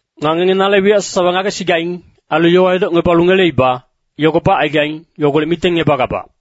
Nga ngenge nale wiyac sasawa ngagesigaing. Ailu yowa edocngebalu ngeleiba, yogo bacaigaing, yogolec mitengngebagabac.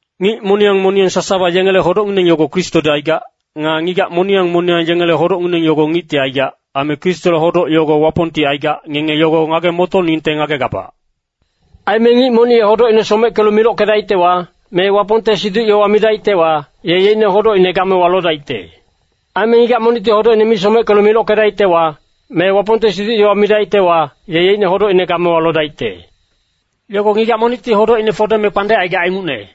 Ngic moniyang moniyang sasawa yengele hodocngineng yogo Kristodi aigac. Nga ngigac moniyang moniyang yengele hodocngineng yogo ngicti aigac. Aime Kristole hodoc yogo Wapongti aigac, ngenge yogo ngage-motoningte ngagegabac. Aime ngic monic ye hodocine someckelu milockedaictewa, me Wapongte siduc-yowa midaictewa, ye yeicne hodocine gamewa lodaicte. Aime ngigac monicti hodocine mi someckelu milockedaictewa, me Wapongte siduc-yowa midaictewa, ye yeicne hodocine gamewa lodaicte. Yogo ngigac monicti hodocine fodeme kpandec aigac ingucne.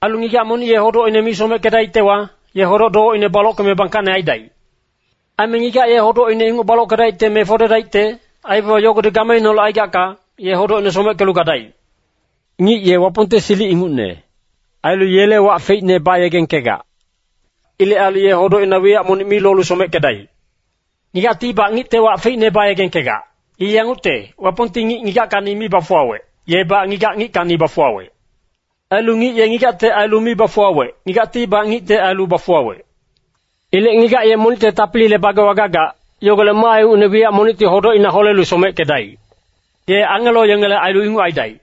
Ailu ngigac monic ye hodocine mi someckedaictewa, ye hodoc-dowecine balockeme bangkacne aidaic. Aime ngigac ye hodocine inguc balockedaicte me fodedaicte, aibaba yogodi gameineholec aigacka, ye hodocine someckelu gadaic. Ngic ye Wapongte silic ingucne. Ailu yele wac feicne bayegengkegac. Ilec ailu ye hodocina wiyac monic mi lolu someckedaic. Ngigactibac ngicte wac feicne bayegengkegac. I yangucte, Wapongti ngic ngigackacni mi bafuwawec, yebac ngigac ngickacni bafuwawec. Ailu ngic ye ngigacte ailu mi bafuwawec, ngigactibac ngicte ailu bafuwawec. Ilec ngigac ye monicte tapilile bagewa gagac, yogolec maa ingucne wiyac monicti hodocina holelu someckedaic. Ye angelo yengele ailu inguc aidaic.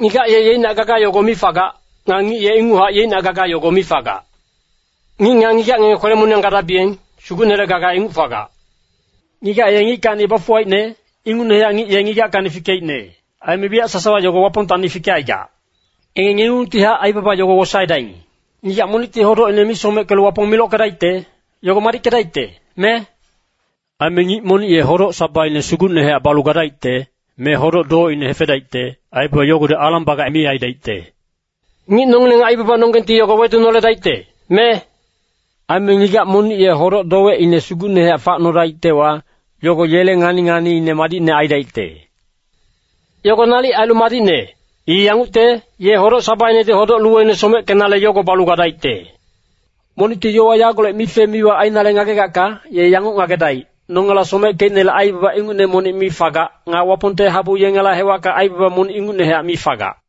Ngigac ye yeicnac gaga yogo mi fagac. Nga ngic ye inguchac yeicnac gaga yogo mi fagac. Ngic nga ngigac ngenge kwele-moniyang gadabiyeng, Sugucnele gaga inguc fagac. Ngigac ye ngickacni bafuwaicne, ingucnehac ngic ye ngigackacni fikeicne, aime wiyac sasawa yogo Wapongtacni fikecaigac. Ngenge ngengungtihac aibaba yogo wosaedaing. Ngigac monicti hodocine mi someckelu Wapong milockedaicte, yogo madickedaicte, me? Aime ngic monic ye hodoc-sabaine sugucnehac balu gadaicte, me hodoc-dowecine hefedaicte, aibaba yogodi alang-baba mi aidaicte. Ngic nongileng aibabanonggengti yogo wedunoledaicte, me? Aime ngigac monic ye hodoc-dowecine sugucnehac facnodaictewa, yogo yele ngani-nganiine madicne aidaicte. Yogo nalic ailu madicne, I yangucte, ye hodoc-sabainedi hodoc-luweine someckenale yogo balu gadaicte. Monicti yowa yagolec mife-miwa ainale ngagegacka, ye yanguc ngagedaic. Nongela someckeicnele aibaba ingucne monic mi fagac. Nga Wapongte habu yengele hewacka aibaba monic ingucnehac mi fagac.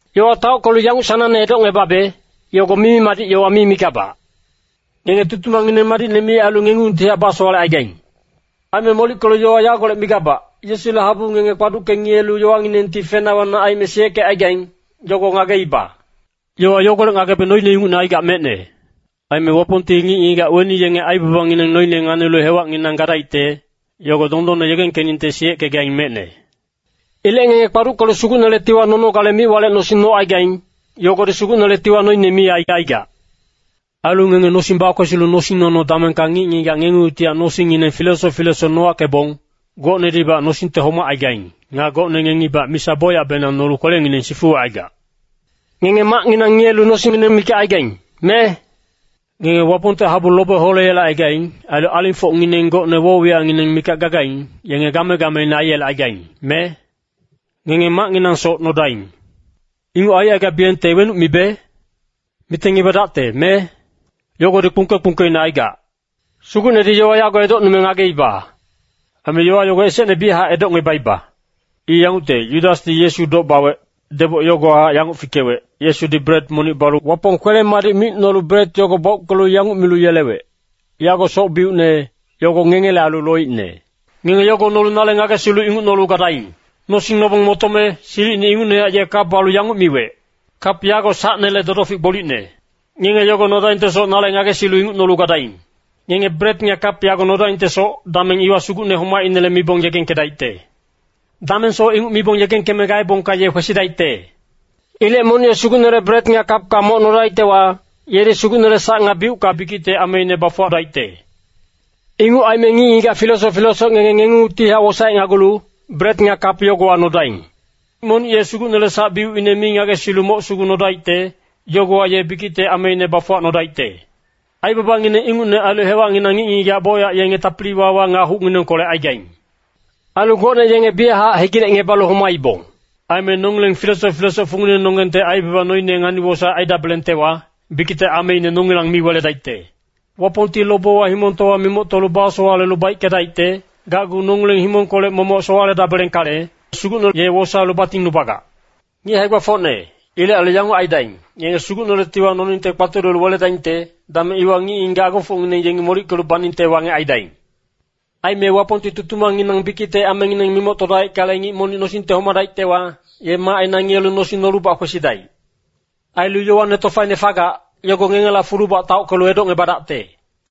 Yowa taockelu yanguc sanangne edocngebabe, yogo mimi-madic yowa mi migabac. Ngenge tutumangngineng madicne mi ailu ngengungtihac basowalecaigaing. Aime molickelu yowa yagolec migabac, Yesule habu ngenge kpaducke ngiyelu yowanginengti fena wana aime siyeckecaigaing, yogo ngageiba. Yowa yogolec ngagebe noine ingucne aigac mecne. Aime Wapongti ngic-ngigac weni yenge aibabangineng noine nganilu hewacnginang gadaicte, yogo dondonne yegengkeningte siyeckegaing mecne. Ilec ngenge kpaduckelu Sugucnele tiwa nonogale mic-walec nosing nocaigaing, yogodi Sugucnele tiwa noine mi aicaigac. Ailu ngenge nosing bakwesilu nosing-nono damengka ngic-ngigac ngengungtihac nosingngineng filesoc filesoc nowackebong, gocnedibac nosingte homacaigaing. Nga gocne ngengibac misa bocyacbenang nolu kwelengineng sifuwecaigac. Ngenge macnginang ngiyelu nosingngineng mikac aigaing, me? Ngenge Wapongte habu lobe holeyelecaigaing. Ailu alingfocngineng gocne woc-wiyacngineng mikac gagaing, yenge game-gameine aiyelecaigaing, me? Ngenge macnginangsoc nodaing. Inguc aicaigabiyengte wenuc mibe? Mitengngebadacte, me? Yogodi kpungke-kpungkeine aigac. Sugucnedi yowa yago edocnume ngageiba. Aime yowa yogo esecne biyachac edocngebaiba. I yangucte, Yudasdi Yesu doc bawec, deboc yogowahac yanguc fikewec, Yesudi bret monic balu Wapong kwele-madic micnolu bret yogo bauckelu yanguc milu yelewec, “Yago soc-biucne, yogo ngengele ailu loicne. Ngenge yogo nolu nale ngagesilu inguc nolu gadaing.” Nosing nobong motome, silicine ingucnehac ye kap balu yanguc miwec, “Kap yago sacnele dodofic gbolicne. Ngenge yogo nodaingtesoc nale ngagesilu inguc nolu gadaing.” Ngenge bret nga kap yago nodaingtesoc, dameng iwa Sugucne homacinele mibong yegengkedaicte. Damengsoc inguc mibong yegengkeme gaebongka ye kwesidaicte. Ilec monic ye Sugucnele bret nga kapka moc nodaictewa, yedi Sugucnele sac nga biucka bikicte ameine bafuwadaicte. Inguc aime ngic-ngigac filesoc filesoc ngenge ngengungtihac wosaecnagulu, bret nga kap yogowa nodaing. Monic ye Sugucnele sac-biucine mi ngagesilu moc sugu nodaicte, yogowa ye bikicte ameine bafuwacnodaicte. Aibabangineng ingucne ailu hewacnginang ngic-ngigac bocyac yenge tapili-wawa nga hucnginengkolec aigaing. Ailu gocne yenge biyachac hegilecngebalu homaibong. Aime nongileng filesoc filesoc funginenonggengte aibaba noine ngani-wosaec aidabelengtewa, bikicte ameine nongilang mi weledaicte. Wapongti lobewa himongtowa mimoctolu basowalelu baickedaicte, gacgu nongileng himongkolec momoc sowaledabelengkale, Sugucne ye wosaelu batingnubagac. Ngic hae-gbafocne, ilec ailu yanguc aidaing, ngenge Sugucnele tiwa noningte kpatulelu weledaingte, dameng iwa ngic-ngigac agofocngineng yengi molickelu baningte wangec aidaing. Aime Wapongti tutumangnginang bikicte amengineng mimoctodaickale, ngic monic nosingte homadaictewa, ye macina ngiyelu nosing nolubac kwesidaic. Ailu yowane tofaine fagac, yogo ngengela fulubac taockelu edocngebadacte.